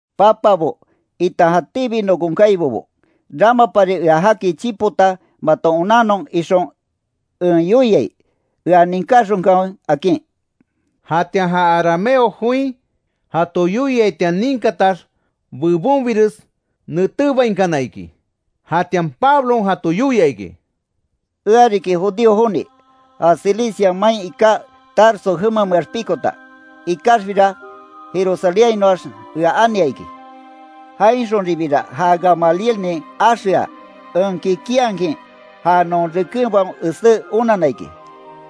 “Papabo, itan jatíbi nokon kaibobo, ramapari ea jaki chipota maton onannon ixon en yoiai, ea ninkáxonkanwe”, akin. Jatian ja arameo join jato yoiaitian ninkatax, bebonbires netébainkana iki. Jatian Pablon jato yoia iki: “Ea riki judío joni, ja Cilicia main iká Tarso jemameax pikota. Ikaxbira Jerusalénhainoax ea ania iki. Jainxonribira ja Gamalielnin axeaa, en kikinhakin ja non rekenbaon esé onanna iki.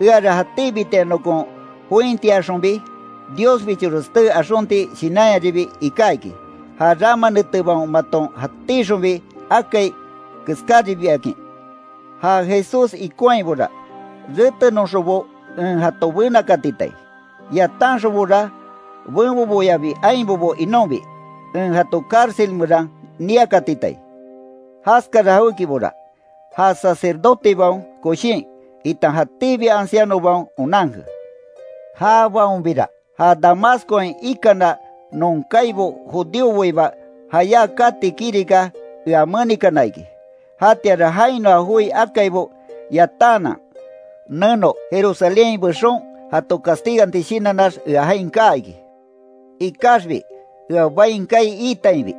Eara jatíbitian nokon jointiayaxonbi Diosbichores tee axonti shinanyaribi iká iki, ja rama netebaon maton jatíxonbi akai keskáribiakin. Ja Jesús ikonhaibora, retenoxonbo en jato benakatitai, yatanxonbora benboboyabi ainbobo inonbi, en jato cárcel meran niakatitai. Jaskara jawékibora, ja sacerdotebaon koshin, itan jatíbi ancianobaon onanke. Jabaonbira ja Damascoain ikana non kaibo judíoboiba jayá kati kirika ea menikana iki. Jatianra jainoa joi akaibo yatanhanan, neno Jerusalénhain bexon, jato castiganti shinannax ea jain kaa iki. Ikaxbi ea bain kaai iitainbi,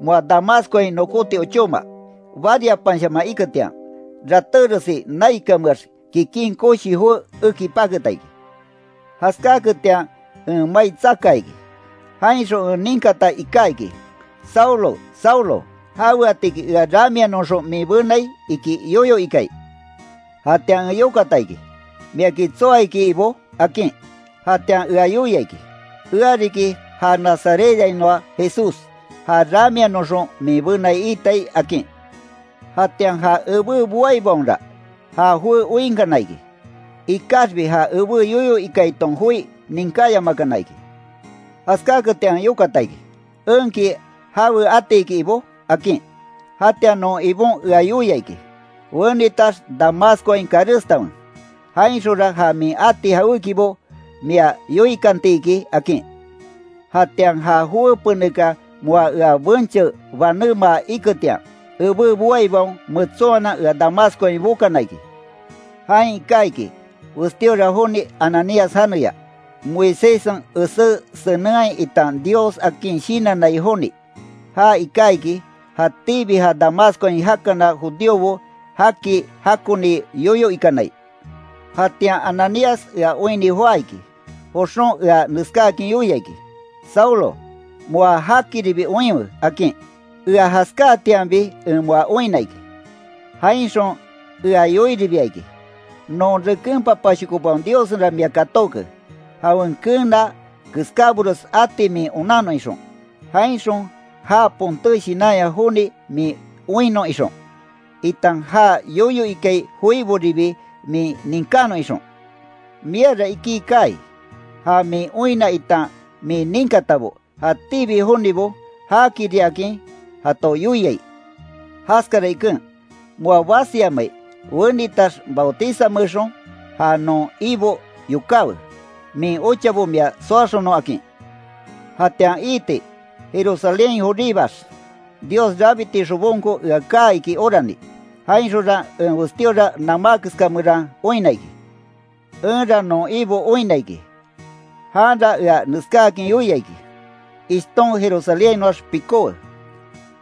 moa Damascoain nokóti ochóma, bariapanshaman iketian, ratéresi naikanmeax kikin koshi joé eki paketa iki. Jaskáketian en mai tsakaa iki. Jainxon en ninkata iká iki: ‘Saulo, Saulo ¿Jaweatiki ea ramianoxon min benai?’ iki yoyo ikai. Jatian en yokata iki: ‘¿Miaki tsoa iki Ibó?’ akin. Jatian ea yoia iki: ‘Ea riki ja Nazarethainoa Jesús, ja ramianoxon min benai iitai’, akin. Jatian ja ebé boaibaonra, ja joé oinkana iki, ikaxbi ja ebé yoyo ikaiton joi ninkáyamakana iki. Jaskáketian en yokata iki: ‘¿Enki jawe atiki, Ibó?’ akin. Jatian non Ibon ea yoia iki: ‘Wenitax Damascoain karestanwe, jainxonra ja min ati jawékibo mia yoikanti iki’, akin. Jatian ja joé penekan moa ea benche banémaa iketian, ebé boaibaon metsonhanan ea Damascoain bokana iki. Jain iká iki, westíora joni Ananías janeya, Moiséssen esé senenhai itan Dios akin shinannai joni. Ja iká iki, jatíbi ja Damascoain jakana judíobo jaki jakoni yoyo ikanai. Jatian Ananías ea oinni joá iki, joxon ea neskáakin yoia iki: ‘Saulo, moa jakiribi oinwe’, akin. Ea jaskáatianbi en moa oinna iki. Jainxon ea yoiribia iki: ‘Non reken papashokobaon Diossenra mia katóke, jawen keena keskábores ati min onannon ixon. Jainxon já ponté shinanya joni min oinnon ixon, itan já yoyo ikai joiboribi min ninkánon ixon. Miara iki kaai, ja min oinna itan min ninkatabo, jatíbi jonibo jaakiriakin jato yoiai. Jaskara iken, moa basiyamai, wenitax bautizameexon, ja non Ibo yokáwe, min ochabo mia soaxonon’, akin. Jatian iiti, Jerusalénhain joríbaax, Dios rabiti xobonko ea kaa iki orani. Jainxonra en westíora namá keska meran oinna iki. Enra non Ibo oinna iki, janra ea neskáakin yoia iki: ‘Ishton Jerusalénhainoax pikówe,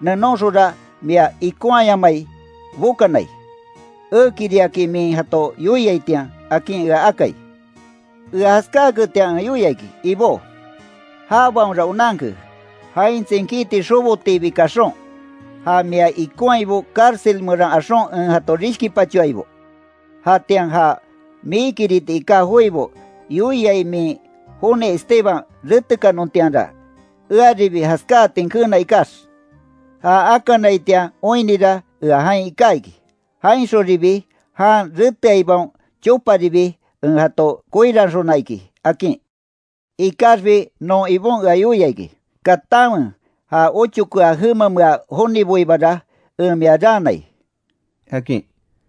nenonxonra mia ikonhayamai bokanai, ekiriakin min jato yoiaitian’, akin ea akai. Ea jaskáaketian en yoia iki: ‘Ibó, jabaonra onanke, jain tsinkiti xobotiibi kaxon, ja mia ikonhaibo cárcel meran axon en jato rishkipachoaibo. Jatian ja miikiriti iká joibo yoiai min joni Esteban retekanontianra, earibi jaskáatin keena ikax, ja akanaitian oinnira ea jain iká iki, jainxonribi jan reteaibaon choparibi en jato koiranxona iki’, akin. Ikaxbi non Ibon ea yoia iki: ‘Katanwe ja ochokea jemamea joniboibara en mia raanai’”, akin.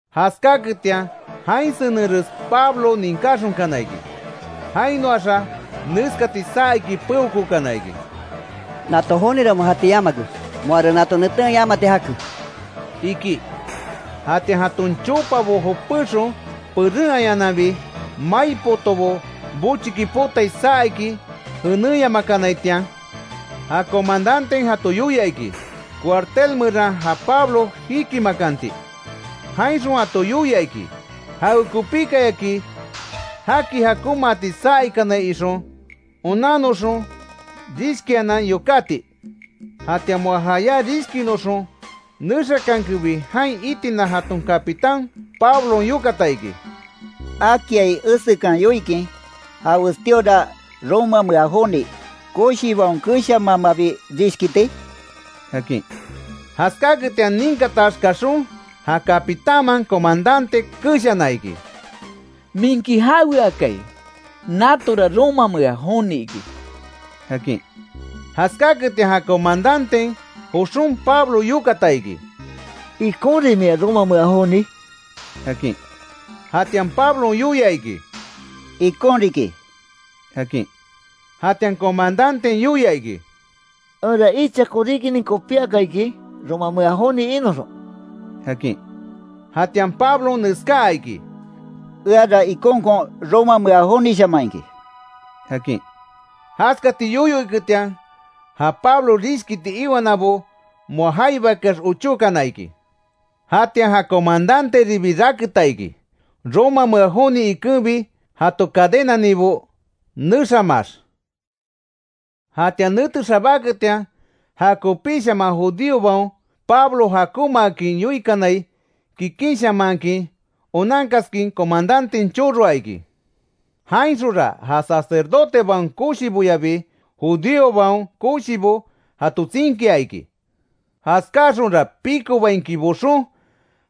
Jaskáaketian, jain senenres Pablo ninkáxonkana iki. Jainoaxa neskati saa iki peokookana iki: “¡Nato jonira moa jati yamake! ¡Moara nato neten yamati jake!” iki. Jatian jaton chopabo jopexon perenhayananbi, mai potobo bochiki potai saa iki jenéyamakanaitian, ja comandanten jato yoia iki, cuartel meran ja Pablo jikimakanti. Jainxon jato yoia iki, jawekopíkayaki, jaki jakonmaati saa ikanai ixon, onannoxon rishkianan yokáti. Jatian moa jayá, rishkinoxon nexakankebi, jain itina jaton capitán, Pablon yokata iki: —¿Akiai esekan yoikin, ja westíora romamea joni, koshibaon keshamaamabi rishkiti? —akin. Jaskáketian ninkatax kaxon ja capitánman comandante keshana iki: —¿Minki jaweakai? Natora romamea joni iki —akin. Jaskaketian ja comandanten joxon, Pablo yokata iki: —¿Ikonrin mia romamea joni? —akin. Jatian Pablon yoia iki: —Ikon riki —akin. Jatian comandanten yoia iki: —Enra icha koríkinin kopíaka, iki romamea joni inoxon —akin. Jatian Pablon neskaa iki: —Eara ikonkon romamea jonishaman iki —akin. Jaskati yoyo iketian, ja Pablo rishkiti iwanabo moa jaibakeax ochókana iki. Jatian ja comandanteribi raketa iki, romamea joni ikenbi jato cadenaninbo nexamaax. Jatian nete xabáketian, jakopíshaman judíobaon Pablo jakonmaakin yoikanai, kikinshamanhakin onankaskin, comandanten choroa iki. Jainxonra ja sacerdotebaon koshiboyabi judíobaon koshibo jato tsinkia iki. Jaskáaxonra pikobainkin boxon,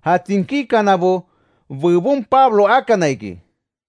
ja tsinkíkanabo bebon Pablo akana iki.